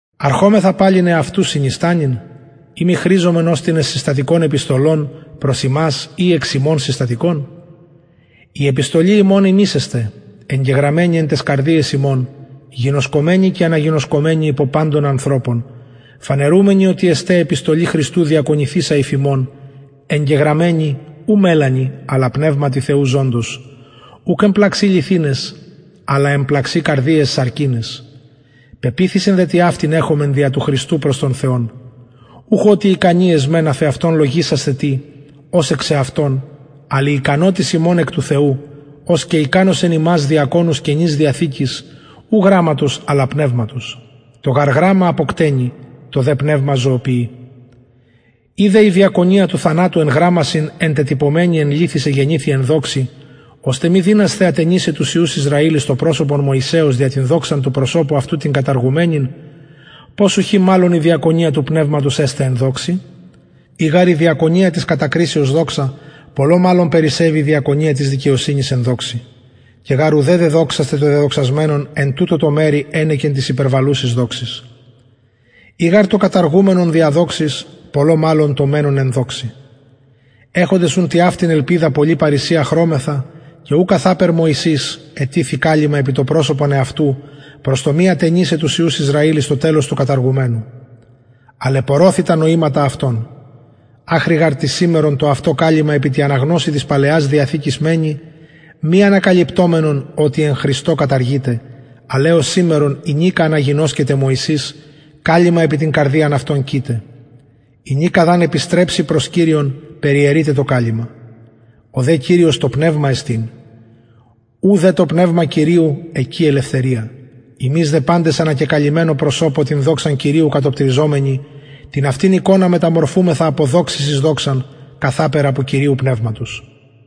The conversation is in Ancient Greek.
αρχομεθα παλιν εαυτους συνιστανειν ει μη χρηζομεν ως τινες συστατικων επιστολων προς υμας η εξ υμων συστατικων η επιστολη ημων υμεις εστε εγγεγραμμενη εν ταις καρδιαις ημων γινωσκομενη και αναγινωσκομενη υπο παντων ανθρωπων φανερουμενοι οτι εστε επιστολη χριστου διακονηθεισα υφ ημων εγγεγραμμενη ου μελανι αλλα πνευματι θεου ζωντος ουκ εν πλαξιν λιθιναις αλλ εν πλαξιν καρδιαις σαρκιναις πεποιθησιν δε τοιαυτην εχομεν δια του χριστου προς τον θεον ουχ οτι ικανοι εσμεν αφ εαυτων λογισασθαι τι ως εξ εαυτων αλλ η ικανοτης ημων εκ του θεου ος και ικανωσεν ημας διακονους καινης διαθηκης ου γραμματος αλλα πνευματος το γαρ γραμμα αποκτενει το δε πνευμα ζωοποιει ει δε η διακονια του θανατου εν γραμμασιν εντετυπωμενη εν λιθοις εγενηθη εν δοξη ωστε μη δυνασθαι ατενισαι τους υιους ισραηλ εις το προσωπον μωυσεως δια την δοξαν του προσωπου αυτου την καταργουμενην πως ουχι μαλλον η διακονια του πνευματος εσται εν δοξη ει γαρ η διακονια της κατακρισεως δοξα πολλω μαλλον περισσευει η διακονια της δικαιοσυνης εν δοξη και γαρ ου δεδοξασται το δεδοξασμενον εν τουτω τω μερει ενεκεν της υπερβαλλουσης δοξης ει γαρ το καταργουμενον δια δοξης πολλω μαλλον το μενον εν δοξη εχοντες ουν τοιαυτην ελπιδα πολλη παρρησια χρωμεθα και ου καθαπερ μωυσης ετιθει καλυμμα επι το προσωπον εαυτου προς το μη ατενισαι τους υιους ισραηλ εις το τελος του καταργουμενου αλλ επωρωθη τα νοηματα αυτων αχρι γαρ της σημερον το αυτο καλυμμα επι τη αναγνωσει της παλαιας διαθηκης μενει μη ανακαλυπτομενον ο τι εν χριστω καταργειται αλλ εως σημερον ηνικα αναγινωσκεται μωυσης καλυμμα επι την καρδιαν αυτων κειται ηνικα δ αν επιστρεψη προς κυριον περιαιρειται το καλυμμα ο δε κυριος το πνευμα εστιν ου δε το πνευμα κυριου εκει ελευθερια ημεις δε παντες ανακεκαλυμμενω προσωπω την δοξαν κυριου κατοπτριζομενοι την αυτην εικονα μεταμορφουμεθα απο δοξης εις δοξαν καθαπερ απο κυριου πνευματος